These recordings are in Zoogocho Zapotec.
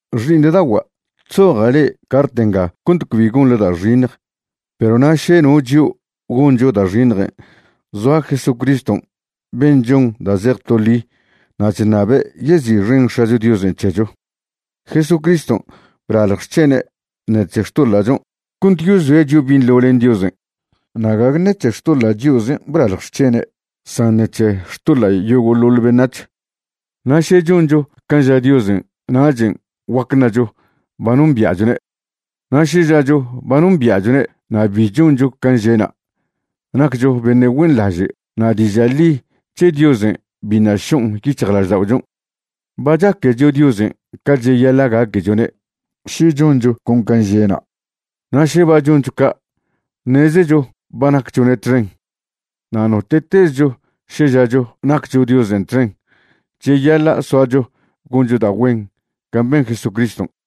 Xi'iṉda'ogua', chzoja' le' cart nga cont cbi gonḻe da' xiṉj. Perw na' še no chio' goncho da' xiṉjen', zoa Jesucriston' ben' chon da' zej to ḻi na' chṉabe' yezi'xen X̱acho Diosen' c̱hecho. Jesucriston' blalj xc̱hene' ṉec̱he xtoḻa'chon' cont yozoe' chio' binḻo len Diosen', na' gague ṉec̱he xtoḻa' chio'zen' blalj xc̱hene' san ṉec̱he xtoḻa' yogo'loḻ beṉac̱h. Na' še choncho can' ža Diosen' nachen' guac ṉacho ba nombia'chwne'. Na' še žacho ba nombia'chwne' na' bi choncho can' že'na', naccho beṉe' güenḻaže' na' diža' ḻi c̱he Diosen' biṉa' šon' yic̱hjlažda'ochon'. Ba chaquecho Diosen' ca cheyaḻa' gaquechone' še choncho con can' že'na', na' še ba choncho ca', ṉezecho ba nacchone' txen. Na' note'tezcho še žacho naccho Diosen' txen, cheyaḻa' soacho goncho da' güen can' ben Jesucriston'.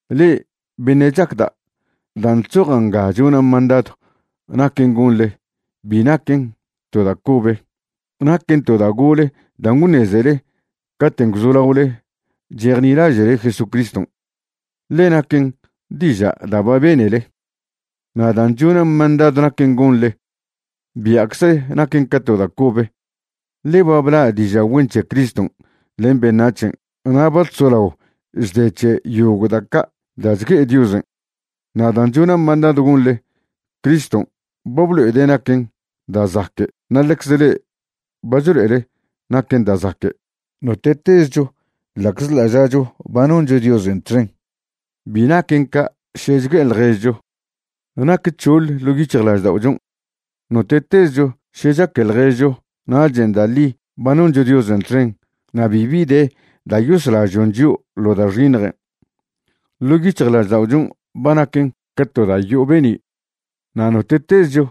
Le'e beṉe' chacda', dan' chzoja' nga chona' mandadw naquen' gonḻe, bi naquen to da' cobe. Naquen to da' gole dan' gwṉezele caten' gwzolaole chejnilaže'le Jesucriston', ḻe naquen diža' da' ba benele. Na' dan' chona' mandadw naquen' gonḻe, bia'cze naquen ca to da' cobe, ḻe ba bla' diža' güen c̱he Criston' len beṉac̱hen' na' ba chzolao chde c̱he yogo' da' ca' da' chgue'e Diosen'. Na' dan' chona' mandadw gonḻe, Criston' ba blo'ede' naquen da' zaque' na' ḻecz le'e ba chlo'ele naquen da' zaque'. Note'tezcho ḻa'czḻa' žacho ba noncho Diosen' txen, bi naquen ca' še chgue'e ḻježcho; nac c̱hoḻ ḻo' lažda'ochon'. Note'tezcho še chaque ḻježcho nachen' da' ḻi ba noncho Diosen' txen na' bibi de da' yoslažon' chio' ḻo da' xiṉjen'. Ḻo' yic̱hjlažda'ochon' ba naquen ca to da' yo'o be'ni'. Na' note'tezcho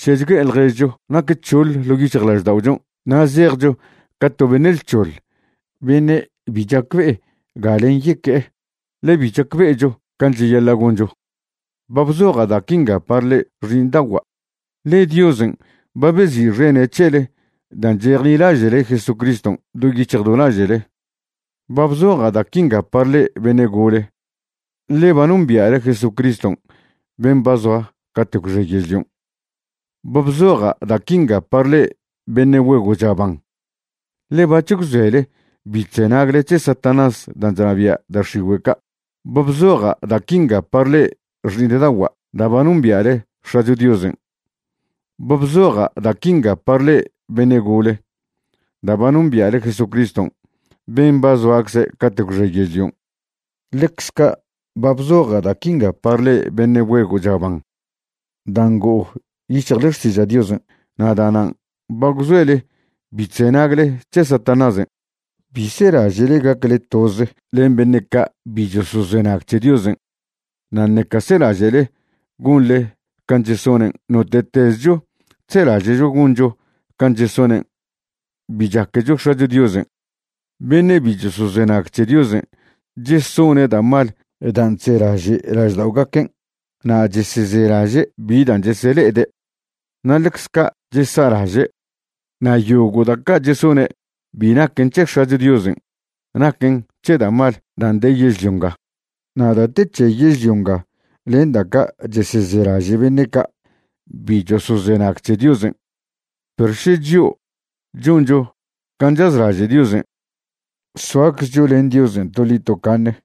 še chgue'e ḻježcho nac c̱hoḻ ḻo' lažda'ochon' na' zejcho ca to beṉe' lc̱hoḻ beṉe' bi chacbe'e galen' yeque'e, ḻe bi chacbe'echo can' cheyaḻa' goncho. Ba bzoja' da' quinga par le'e xi'iṉda'ogua', ḻe Diosen' ba bezi'xene' c̱hele dan' chejnilaže'le Jesucriston' do yic̱hj do laže'le. Ba bzoja' da' quinga par le'e beṉe' gole, ḻe ba nombia'le Jesucriston' ben' ba zoa cate' gwxe yežlion'. Ba bzoja' da' quinga par le'e beṉe' güego' chaban, ḻe bac̱h gwzoele bi chzenagle c̱he Satanás dan' chnabia' da' x̱igüe' ca'. Ba bzoja' da' quinga par le'e xi'iṉda'ogua' da' ba nombia'le X̱acho Diosen'. Ba bzoja' da' quinga par le'e beṉe' gole, da' ba nombia'le Jesucriston' ben' ba zoacze cate' gwxe yežlion'. Ḻecz ca' ba bzoja' da' quinga par le'e beṉe' güego' chaban da' ngo'o yic̱hjle xtiža' Diosen' na' da'nan' ba gwzoele bi chzenagle c̱he Satanásen'. Bi selaže'le gacle toze len beṉe' ca' bi chosozenag c̱he Diosen', na' ṉeca selaže'le gonḻe can' chesonen'. Note'tezcho chzelaže'cho goncho can' chesonen', bi chaquecho X̱acho Diosen'. Beṉe' bi chosozenag c̱he Diosen' chesone' da' mal dan' chzelaže' lažda'ogaquen', na' chesezelaže' bi dan' chesele'ede', na' ḻecz ca' chesa'laže'. Na' yogo' da' ca' chesone' bi naquen c̱he X̱acho Diosen', naquen c̱he da' mal dan' de yežlio nga. Na' da' te c̱he yežlio nga len da' ca' chesezelaže' beṉe' ca' bi chosozenag c̱he Diosen'. Perw še chio' choncho can' chazlaže' Diosen', soaczcho len Diosen' toḻi tocaṉe.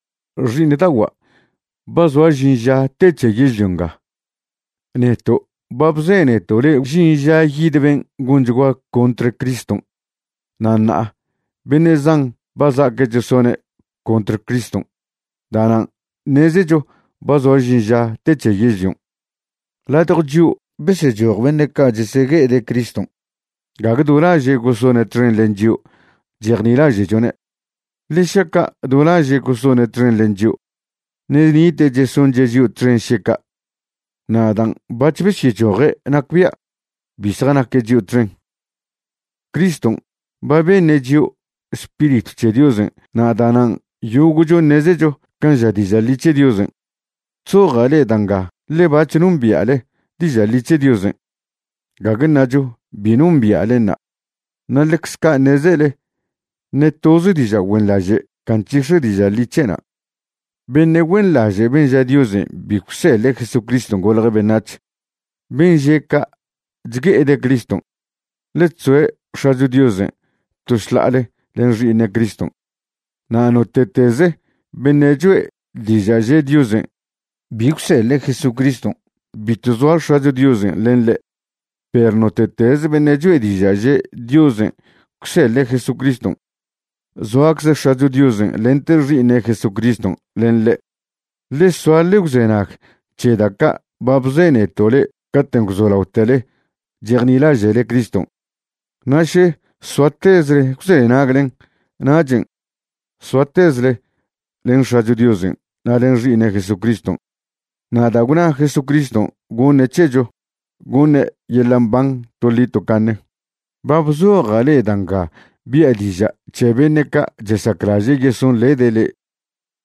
Xi'iṉda'ogua', ba zoa žin ža te c̱he yežlio nga. Neto' ba bzeneto' le'e gwžin ža yid ben' gonchgua contr Criston', na' ṉa'a beṉe' zan ba za'aque' chesone' contr Criston'. Da'nan' ṉezecho ba zoa žin ža te c̱he yežlion'. Ladjo chio' besechoj beṉe' ca' chesegue'ede' Criston'. Gague do laže' gosone' txen len chio' chejnilaže'chone'. Ḻe šaca' do laže' gosone' txen len chio', ṉe' nite' chesonche' chio' txen še ca'. Na' dan' bac̱h besyechoje' nacbia' bi zjanaque' chio' txen. Criston' ba beṉe' chio' Spiritw c̱he Diosen' na' da'nan' yogo'cho ṉezecho can' ža diža' ḻi c̱he Diosen'. Chzoja' le'e da' nga ḻe bac̱h nombia'le diža' ḻi c̱he Diosen', gague ṉacho bi nombia'lenṉa', na' ḻecz ca' ṉezele ṉe toz diža' güenḻaže' ca nc̱hix̱e diža' ḻi c̱he'na'. Beṉe' güenḻaže' ben' ža Diosen' bi gwseḻe' Jesucriston' golje' beṉac̱h. Ben' že' ca' chgue'ede' Criston', ḻe chzoe' X̱acho Diosen' to šḻa'ale len Xi'iṉe' Criston'. Na' note'tez beṉe' cho'e diža' že' Diosen' bi gwseḻe' Jesucriston', bitw zoa X̱acho Diosen' len ḻe'. Perw note'tez beṉe' cho'e diža' že' Diosen' gwseḻe' Jesucriston', zoacze X̱acho Diosen' lente Xi'iṉe' Jesucriston' len ḻe'. Ḻe soa ḻe gwzenag c̱he da' ca' ba bzeneto' le'e caten' gwzolaotele chejnilaže'le Criston'. Na' še soatezle gwzenaglen, nachen' soatezle len X̱acho Diosen' na' len Xi'iṉe' Jesucriston'. Na' da' gwna Jesucriston' goṉe' c̱hecho, goṉe' yeḻa' mban toḻi tocaṉe. Ba bzoja' le'e da' nga bia' diža' c̱he beṉe' ca' chesaclaže' yesonḻede' le'e.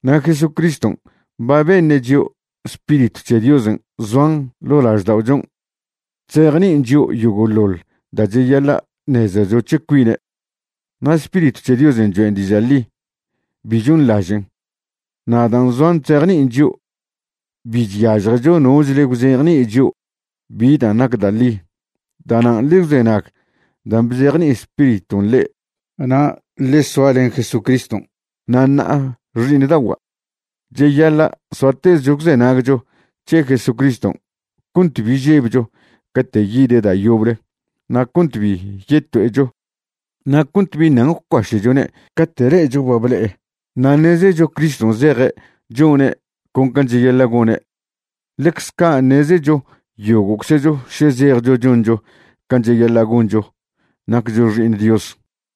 Na' Jesucriston' ba beṉe' chio' Spiritw c̱he Diosen' zoan ḻo' lažda'ochon' chzejni'in chio' yogo'ḻoḻ dan' cheyaḻa' ṉezecho c̱he cuine'. Na' Spiritw c̱he Diosen' choen' diža' ḻi, bi chonḻažen'. Na' dan' zoan chzejni'in chio', bi chyažjecho nochle gwzejni'i chio' bi dan' nac da' ḻi. Da'nan' ḻe gwzenag dan' bzejni'i Spiriton' le'e na' ḻe soa len Jesucriston'. Na' ṉa'a xi'iṉda'ogua', cheyaḻa' soatezcho gwzenagcho c̱he Jesucriston' cont bi žebcho cate' yide' da' yoble na' cont bi yeto'echo na' cont bi ṉan gwcuaše'chone' cate' le'echo ba ble'e. Na' ṉezecho Criston' zeje' chone' con can' cheyaḻa' gone', ḻecze ca' ṉezecho yogo'czecho še zejcho choncho can' cheyaḻa' goncho naccho xi'iṉ Dios.